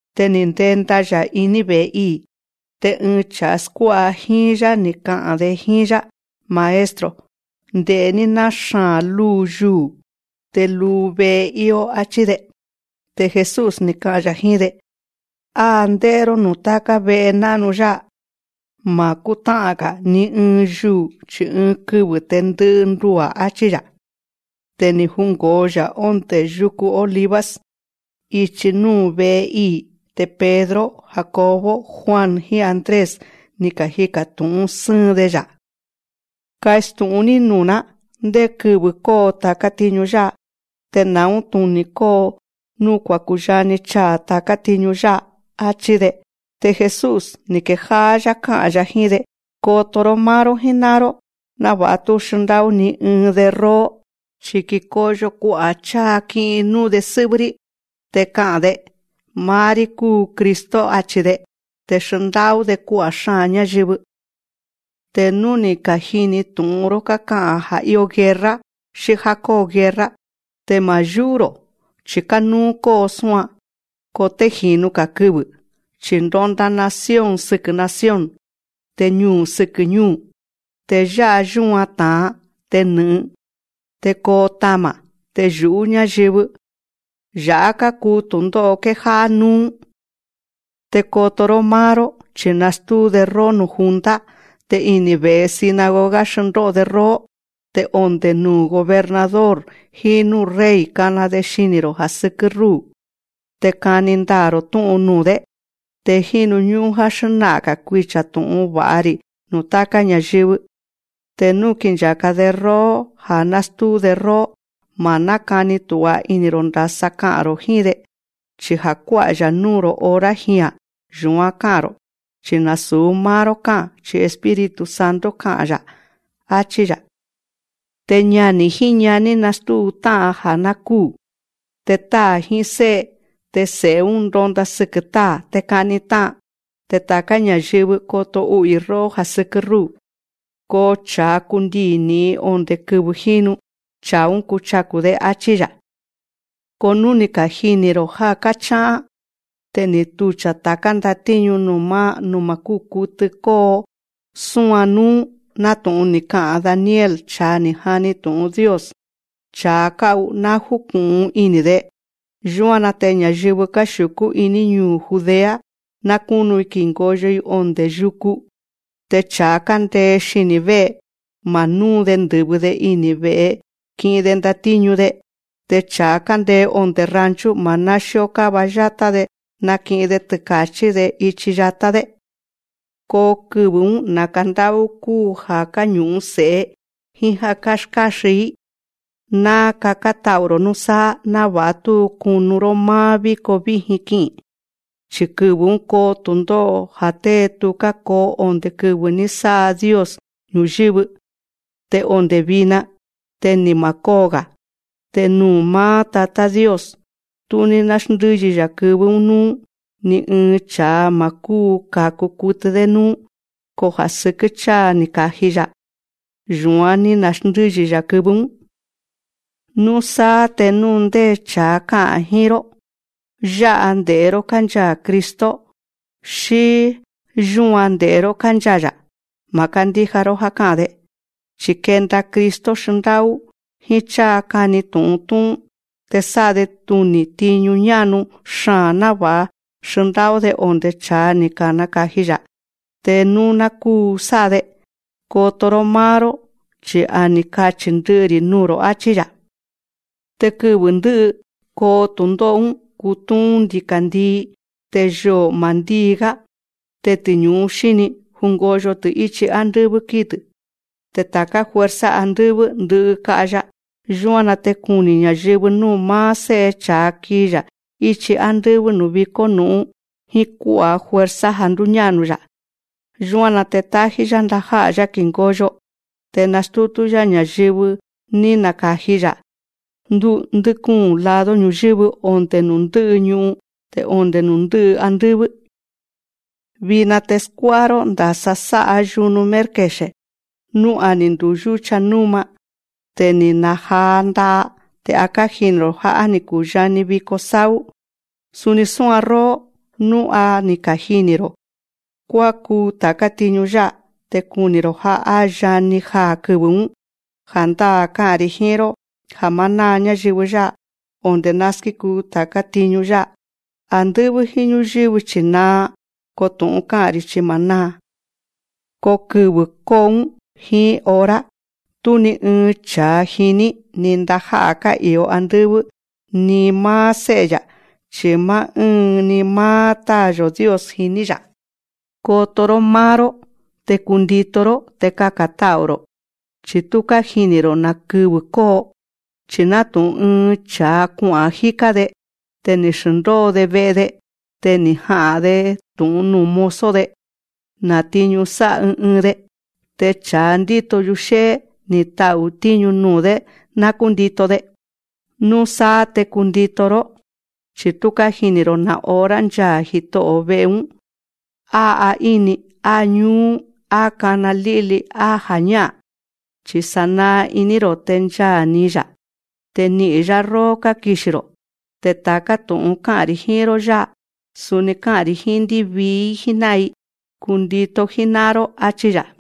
Te ni̱ ndenda‑ya̱ iní ve̱'e ii̱. Te ɨɨn cha̱a skuá'a jíín‑yá, ni̱ ka'a̱n‑de jíín‑yá: Maestro, nde̱'é‑ní ná xaa̱n lúu yuu̱ te luu ve'e íó, áchí‑de. Te Jesús, ni̱ ka'a̱n‑ya̱ jíín‑de: Á ndé'é‑ró núu̱ táká ve'e ná'nu yá'a. Ma̱ kútá'an‑ga̱ ni ɨɨn yuu̱, chi̱ ɨɨn kɨvɨ̱ te ndɨ'ɨ ndua̱, áchí‑ya̱. Te ni̱ jungo̱o‑ya̱ ondé yuku Olivos, ichi núu̱ vé'e ii̱. Te Pedro, Jacobo, Juan, jíín Andrés, ni̱ kajika̱ tu̱'ún sɨ́ɨn‑de‑ya̱: Kastu̱'ún‑ní nuu̱‑ná. Ndé kɨvɨ̱ kóo ta̱ká tiñu yá'a. Te na̱ún tuni̱ koo nuu̱ kúyani chaa̱ ta̱ká tiñu yá'a, áchí‑de. Te Jesús, ni̱ kejá'á‑yá ká'a̱n‑ya̱ jíín‑de: Koto‑ró máá‑ró jíná'an‑ró, náva̱'a tú xndá'ú ni ɨɨn‑de róó. Chi̱ kikoyo kua'a̱ cháa ki'in núu‑de sɨ́'vɨ́‑rí, te ka'a̱n‑de: Máá‑rí kúu Cristo, achi̱‑de. Te xndá'ú‑de kua'a̱ xáa̱n ñáyɨvɨ. Te nú ni̱ ka̱jini tu̱'un‑ró káka'a̱n ja̱ íó guerra xí já kóo guerra, te ma̱ yú'ú‑ro̱. Chi̱ kánúú kóo súan. Ko té ji̱nu‑ga̱ kɨvɨ̱. Chi̱ ndonda nación sɨkɨ̱ nación, te ñuu̱ sɨkɨ̱ ñúu̱. Te yá'a yúan ta̱an, te nɨ̱'ɨn, te koo tama̱, te nɨ̱'ɨn ña̱yɨvɨ. Ya̱'á kákuu tu̱ndó'o kéjá'á núú. Te koto‑ró máá‑ró, chi̱ nastúu‑de róó nuu̱ junta. Te ini̱ ve̱'e sinagoga xndó'o‑de róó. Te onde̱ nuu̱ gobernador jíín núu̱ rey kana‑de xini̱‑ro̱ já sɨkɨ́ rúu̱. Te kani ndaa̱‑ro̱ tú'un nuu̱‑dé. Te jínu ñú'ún já xná'a̱n‑ga̱ kuicha̱ tu̱'un va̱'a‑ri̱ nuu̱ táká ña̱yɨvɨ. Te nú kincha̱ka‑de róó, ja̱ nástúu‑de róó, ma̱ nákani tu̱'a ini̱‑ro̱ ndasa ka'a̱n‑ro̱ jíín‑de. Chi ja̱ kuá'a‑ya̱ núu̱‑ro̱ hora jia̱n, yu̱án ká'a̱n‑ro̱. Chi̱ nasu̱ máá‑ró ká'a̱n, chi̱ Espíritu Santo ka'a̱n, áchí‑ya̱. Te ñani̱ jíín ñaní nastúu tá'an ja̱ ná kúu̱. Te táa̱ jíín sé'e, te se̱'e‑ún ndonda sɨkɨ̱ táa̱, te ka'ni tá'an. Te ta̱ká ña̱yɨvɨ, koto u'u̱‑i róó ja̱ sɨkɨ́ rúu̱. Ko cha̱a kundii̱ ni̱'in onde̱ kɨvɨ̱ jínu, cha̱a‑ún ka̱ku, áchí‑ya̱. Ko nú ni̱ kajini̱‑ro̱ já káchá'án te ni̱ tucha̱ ta̱ká ndatíñu nuu̱ má kúu kutɨ kóo súan núú, nátu̱'un ni̱ ka'a̱n Daniel cha̱a ni̱ jani tu̱'un Dios (cha̱a ká'u, ná júku̱'un ini̱‑de), yúan‑na te ña̱yɨvɨ káxiu̱kú iní ñuu̱ Judea, ná kúnu‑i ki̱ngoyo‑i onde̱ yuku. Te cha̱a kándee xini̱ vé'e, ma̱ núu‑de ndɨ̱vɨ‑de ini̱ ve̱'e ki'in‑de ndatíñu‑de. Te cha̱a kándee onde̱ rancho, ma̱ náxíó káva yátá‑de náki'in‑de tɨka̱chí‑de ichi yatá‑dé. Ko kɨvɨ̱‑ún naka̱ ndá'ú kuu ja̱ káñu̱'un se̱'e, jíín já káskáxin‑í. Ná kakán ta'u̱‑ro̱ núsáá, náva̱'a tú kunu‑ró máá víko víjin ki'i̱n‑ro̱. Chi̱ kɨvɨ̱‑ún koo tu̱ndó'o, ja̱ té tuká koo onde̱ kɨvɨ̱ ní sá'a Dios ñu̱yɨ́vɨ, te onde̱ vina, te ni ma̱ kóo‑ga̱. Te nú máá Tatá Dios, tú ní náxndɨ́yi‑ya̱ kɨvɨ́‑ún núú, ni ɨɨn cha̱a ma̱ káku kutɨ‑dé núú. Ko ja̱ sɨkɨ́ cháa ni̱ naka̱ji‑ya̱, yu̱án ní na̱xndɨ́yi‑ya̱ kɨvɨ́‑ún. Núsáá te nú ndé cha̱a ká'a̱n jíín‑ró: Yá'a nde̱'é‑ró kánchaa̱ Cristo, xí: Yúan nde̱'é‑ró kánchaa̱‑ya̱, ma̱ kándíja‑ró já ká'a̱n‑de. Chi̱ kenda Cristo xndá'ú, jíín cháa kani tu̱'un tú'ún. Te sá'a‑de tuni̱ tiñu ñá'nu xaa̱n, náva̱'a xndá'ú‑de onde̱ cha̱a ni̱ naka̱ji‑ya̱, te nú ná kúu sá'a‑de. Koto‑ró máá‑ró, chi̱ a ni̱ kachi̱ ndɨ'ɨ‑ri̱ nuu̱‑ro̱, áchí‑ya̱. Te kɨvɨ̱ ndɨ́'ɨ koo tu̱ndó'o‑ún, kutúún ndika̱ndii, te yoo̱ ma̱ ndíi‑gá. Te tiñu̱ú xíní, jungoyo‑tɨ̱ íchi ándɨ́vɨ́ kíi‑tɨ̱. Te ta̱ká fuerza andɨ́vɨ́, ndɨ'ɨ ka'ya. Yúan‑na te kuni̱ ña̱yɨvɨ núu̱ máá Sé'e cha̱a kii‑ya̱ íchi ándɨ́vɨ́ núu̱ vikó nu̱'ún jíín kuá'a̱ fuerza ja̱ ndúñá'nu‑ya̱. Yúan‑na te tájí‑yá ndajá'a̱‑yá ki̱ngoyo. Te nastútú‑yá ña̱yɨvɨ ní naka̱ji‑ya̱ ndɨ́kúu̱n lado ñu̱yɨ́vɨ, onde̱ nuu̱ ndɨ́'ɨ ñu'un, te onde̱ nuu̱ ndɨ́'ɨ andɨ́vɨ́. Vina te skuá'a‑ró ndasa sá'a yunu mérkexe̱. Nú a ni̱ nduyúcha núma, te ni̱ na̱jaa nda'a, te a kájini̱‑ro̱ já á ni̱ kuyani viko sáú. Suni súan róó, nú a ni̱ kajini̱‑ro̱ kuákuu ta̱ká tiñu yá'a, te kuni̱‑ro̱ já á yani jaa̱ kɨvɨ̱‑ún. Ja̱ndáa̱ ká'a̱n‑ri̱ jíín‑ró ja̱ má náa ñáyɨvɨ yá'a, onde̱ ná skíkuu ta̱ká tiñu yá'a. Andɨ́vɨ́ jíín ñúyɨ́vɨ chi̱ naa, ko tu̱'un ká'a̱n‑ri̱ chi ma̱ náa. Ko kɨvɨ̱ kóo‑ún, jíín hora, tú ni ɨɨn cha̱a jiní, ni ndajá'a̱ ká'i̱o andɨ́vɨ́, ni máá Sé'e‑ya̱, chi̱ máá ɨ́ɨn‑ni máá Táa̱‑yo̱ Dios jiní‑ya̱. Koto‑ró máá‑ró, te kundito‑ró, te kaka̱n ta'u̱‑ro̱. Chi̱ tú kájini̱‑ro̱ na̱ kɨvɨ̱ kóo. Chi̱ nátu̱'un ɨɨn cha̱a kua'a̱n jíká‑de. Te ni̱ xndóo‑de ve'e‑de. Te ni̱ ja̱'a‑de tu̱'un nuu̱ mozo‑de, ná tiñu sá'a ɨɨn ɨɨn‑de. Te cha̱a ndíto yuxé'é, ni̱ ta'u̱ tíñu nuu̱‑dé, ná kúndito‑de. Núsáá te kundito‑ró, chi̱ tú kájini̱‑ro̱ na̱ hora nchaa̱ jito'o̱ ve'e‑ún, á aíni, á ñúú, á kána lí'li, á ja̱ñá'a̱n. Chi̱ sánaa iní‑ro̱ te nchaa̱‑ni‑ya̱. Te ni'i̱n‑yá róó kákixi̱‑ro̱. Te ta̱ká tu̱'un ká'a̱n‑ri̱ jíín‑ró yá'a, suni ká'a̱n‑ri̱ jíín ndívii‑í jíná'an‑i. Kundito jíná'an‑ró, áchí‑ya̱.